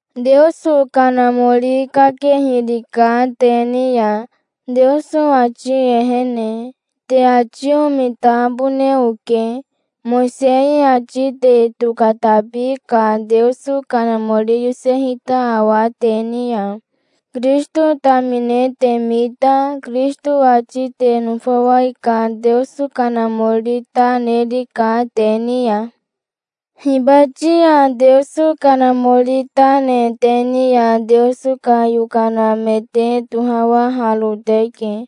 Teoso Kanamori kakehirika te ni ya, Teoso ati ehene. Te ati omitabone oke. Mowisei ati te tokatabi ka Teoso Kanamori yosehita awa te ni ya? Kirisito tamine te mita Kirisito ati te nofawai ka Teoso Kanamori ta nerika te ni ya. Hibati ya Teoso Kanamori ta ne te ni ya Teoso ka yokana me te tohawaharo teke.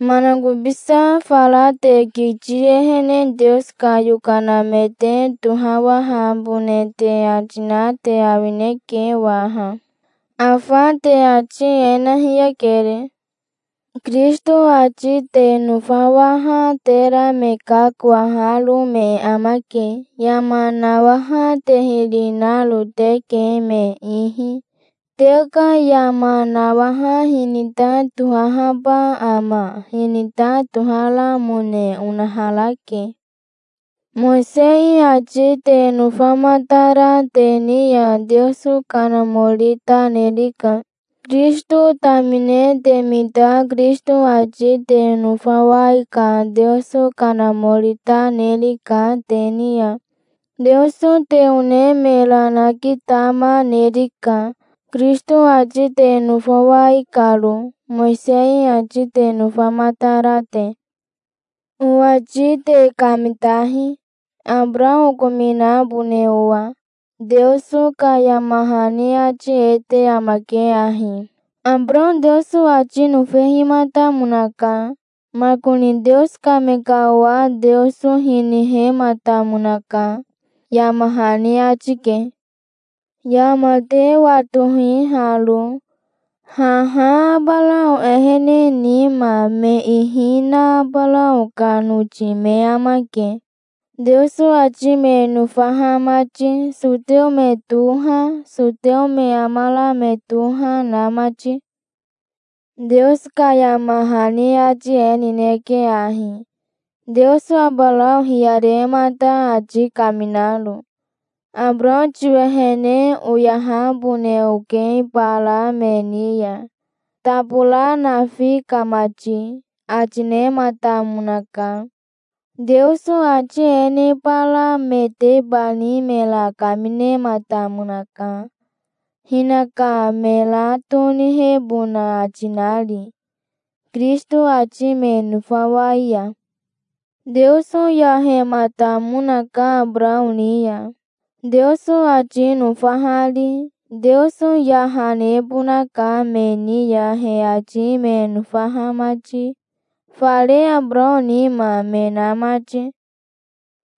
Manakobisa fara te kiti ehene Teoso ka yokana me te tohawahabone te ati na te awineke waha. Afa te ati e na hiyakere. Kirisito ati te nofawaha tera me kakowaharo me amake. Yama nawaha te hiri naro teke me ihi. Te ka yama nawaha hinita tohahaba ama? Hinita toharamone onaharake. Mowisei ati te nofamatara te ni ya Teoso Kanamori ta nerika. Kirisito tamine te mita Kirisito ati te nofawai ka Teoso Kanamori ta nerika te ni ya. Teoso te one mera nakitama nerika, Kirisito ati te nofawai karo, Mowisei ati te nofamatara te. Owati te kamitahi, Abarao okominabone owa. Teoso ka yama hani ati e te amake ahi: "Abarao Teoso ati nofehimatamonaka. Makoni Teoso ka me ka owa Teoso hinihematamonaka", yama hani ati ke. Yama te watohi haro: Haha Abarao ehene nima me ihi na Abarao ka noti me amake, Teoso ati me nofaha mati, soteo me toha, soteo me amara me toha na mati. Teoso ka yama hani ati e nineke ahi, Teoso Abarao hiyaremata ati kaminaro: "Abarao tiwehene oyahabone oke bara me ni ya, tabora nafi ka mati", ati nematamonaka. Teoso ati e ne bara metebani mera kaminematamonaka, hinaka mera tonihebona ati nari, Kirisito ati me nofawai ya. Teoso yahematamonaka Abarao ni ya, Teoso ati nofahari. Teoso yaha nebonaka me ni ya he ati me nofaha mati, fare Abarao nima me na mati.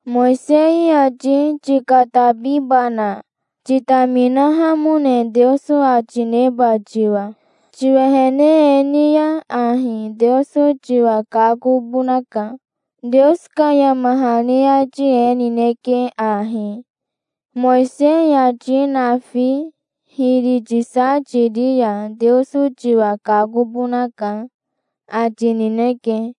Mowisei ati tikatabibana, titaminahamone Teoso ati neba tiwa? Tiwehene e ni ya ahi Teoso tiwa kakobonaka. Teoso ka yama hani ati e nineke ahi: "Mowisei ati nafi hiri tisa tiri ya Teoso tiwa kakobonaka", ati nineke.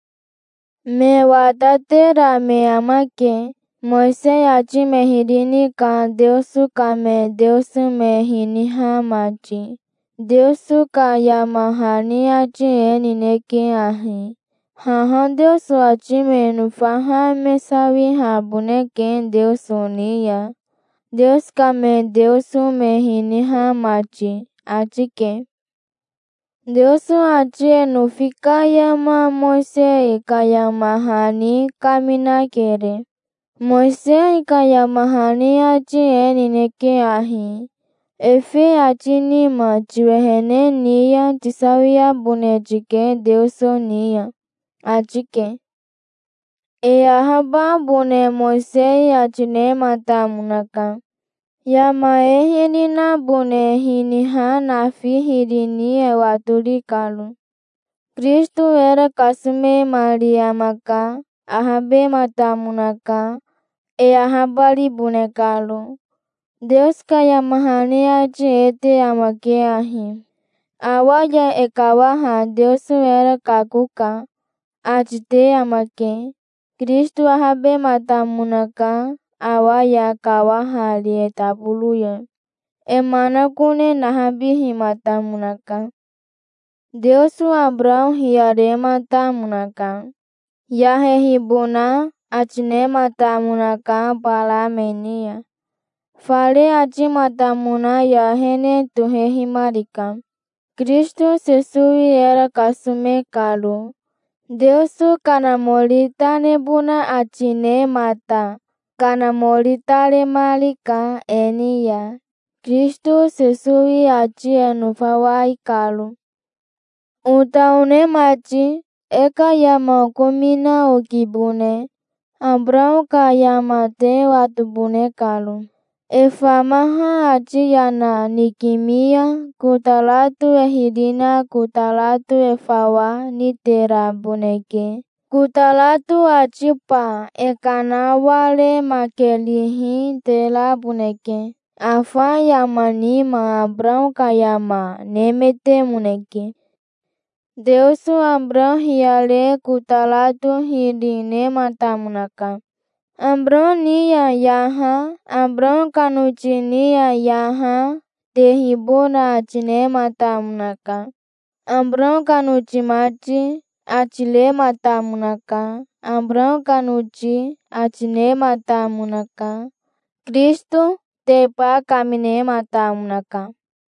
Me watatera me amake, Mowisei ati me hiri ni ka Teoso ka me Teoso me hiniha mati. Teoso ka yama hani ati e nineke ahi: Haha Teoso ati me nofaha me sawihaboneke Teoso ni ya, Teoso ka me Teoso me hiniha mati", ati ke. Teoso ati e nofi ka yama Mowisei ka yama hani kaminakere. Mowisei ka yama hani ati e nineke ahi: "Efe ati nima tiwehene ni ya tisawiabone tike Teoso ni ya", ati ke. E ahababone Mowisei ati nematamonaka, yama e hiri nabone hinaha nafi hiri ni e watori karo. Kirisito era kasomemari amaka. Ahabematamonaka, e ahabaribone karo. Teoso ka yama hani ati e te amake ahi: "Awa ya e kawaha Teoso era kakoka", ati te amake. Kirisito ahabematamonaka, awa ya kawahari e taboro ya. E manakone nahabihimatamonaka. Teoso Abarao hiyarematamonaka. Yahehibona ati nematamonaka bara me ni ya. Fare atimatamona ya ehene tohehimarika, Kirisito Sesowi era kasome karo. Teoso Kanamori ta nebona ati nemata Kanamori ta nemarika e ni ya, Kirisito Sesowi ati e nofawai karo. Ota one mati, e ka yama okomina okibone, Abarao ka yama te watobone karo. E famaha ati yana nikimi ya kotarato e hiri na kotarato e fawa niteraboneke. Kotarato atiba e kanawaremakerihi teraboneke. Afa yama nima Abarao ka yama nemetemoneke. Teoso Abarao hiyare kotarato hiri nematamonaka. Abarao ni ya yaha, Abarao ka noti ni ya yaha, tehibona ati nematamonaka. Abarao ka noti mati, ati rematamonaka. Abarao ka noti, ati nematamonaka. Kirisitoteba kaminematamonaka.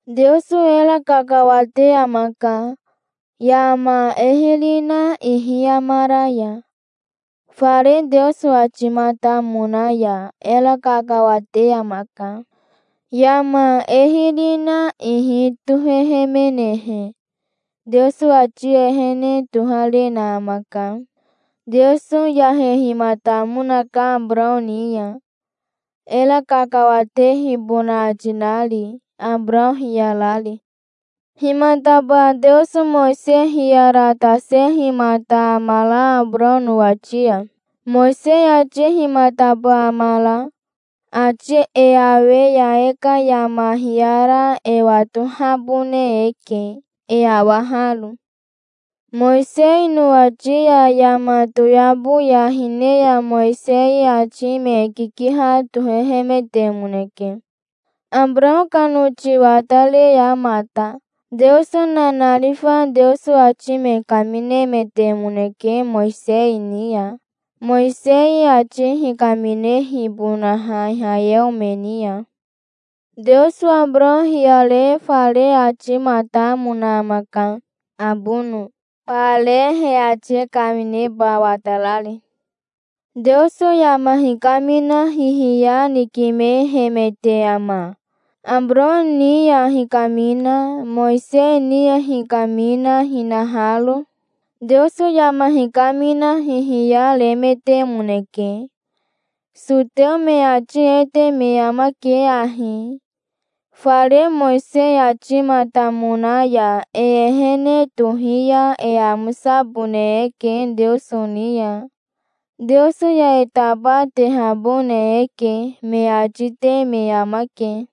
Teoso era kakawate amaka, yama e hiri na ihi amara ya. Fare Teoso atimatamona ya era kakawate amaka. Yama e hiri na ihi tohehemenehe Teoso ati ehene toharena amaka. Teoso yahehimatamonaka Abarao ni ya, era kakawatehibona ati nari, Abarao hiyarari. Himataba Teoso Mowisei hiyaratasehimata amara Abarao nowati ya? Mowisei ati himataba amara? Ati e awe ya e ka yama hiyara e watohabone eke, e awaharo. Mowisei nowati ya yama toyabo ya hine ya Mowisei ati me kikiha tohehemetemoneke, Abarao ka noti watare ya mata. Teoso nanarifa Teoso ati me kaminemetemoneke Mowisei ni ya, Mowisei ati hikaminehibonaha Ihayeo me ni ya. Teoso Abarao hiyare fare atimatamona amaka, abono, bare he ati kamineba watarari. Teoso yama hikamina hihiya nikimehemete ama, Abarao ni ya hikamina, Mowisei ni ya hikamina hinaharo? Teoso yama hikamina hihiya remetemoneke. Soteo me ati e te me amake ahi: "Fare Mowisei atimatamona ya e ehene tohi ya e amosabone eke Teoso ni ya. Teoso ya e tabatehabone eke", me ati te me amake.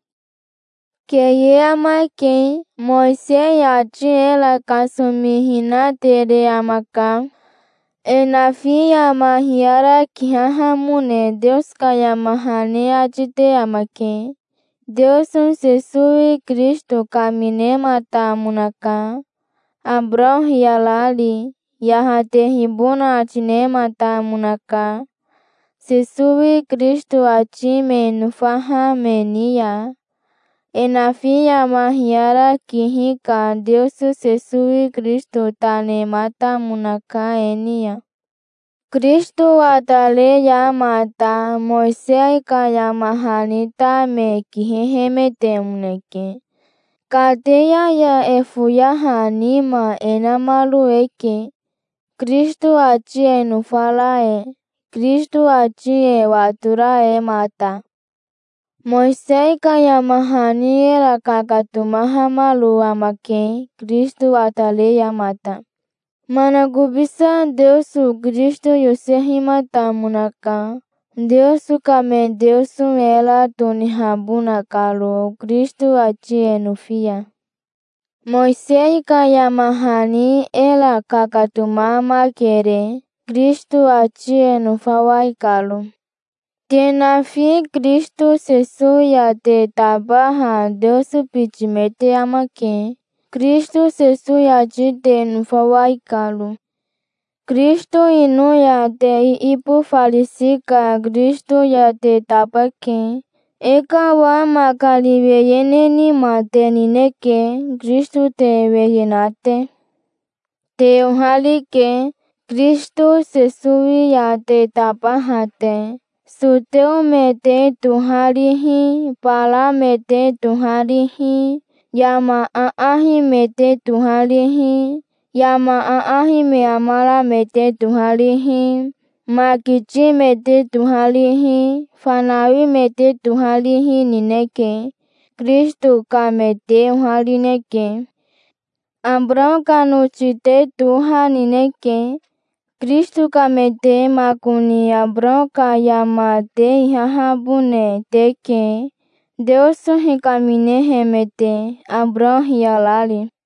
Keye amake. Mowisei ati era kasomihina tere amaka. E nafi yama hiyara kihahamone Teoso ka yama hani ati te amake. Teoso Sesowi Kirisito kaminematamonaka, Abarao hiyarari. Yahatehibona ati nematamonaka, Sesowi Kirisito ati me nofaha me ni ya. E nafi yama hiyara kihi ka Teoso Sesowi Kirisito ta nematamonaka e ni ya. Kirisito watare ya mata Mowisei ka yama hani ta me kihehemetemoneke. Kateya ya e foyaha nima e namaro eke, Kirisito ati e nofara e, Kirisito ati e watora e mata. Mowisei ka yama hani era kakatomahamaro amake Kirisito watare ya mata. Manakobisa Teoso Kirisito yosehimatamonaka, Teoso ka me Teoso era tonihabona karo, Kirisito ati e nofi ya. Mowisei ka yama hani era kakatomamakere, Kirisito ati e nofawai karo. Te nafi Kirisito Sesowi ya te tabaha Teoso biti me te amake, Kirisito Sesowi ati te nofawai karo. Kirisito ino ya te iibofarisi ka Kirisito ya te tabake. E ka owa makari weye ne nima te nineke, Kirisito te weye na te. Te oharike, Kirisito Sesowi ya te tabaha te. Soteo me te toharihi, bara me te toharihi, yama aahi me te toharihi, yama aahi me amara me te toharihi, makiti me te toharihi, fanawi me te toharihi nineke. Kirisito ka me te oharineke. Abarao ka noti te toha nineke, Kirisito ka me te. Makoni Abarao ka yama te ihahabone teke, Teoso hikaminehemete, Abarao hiyarari.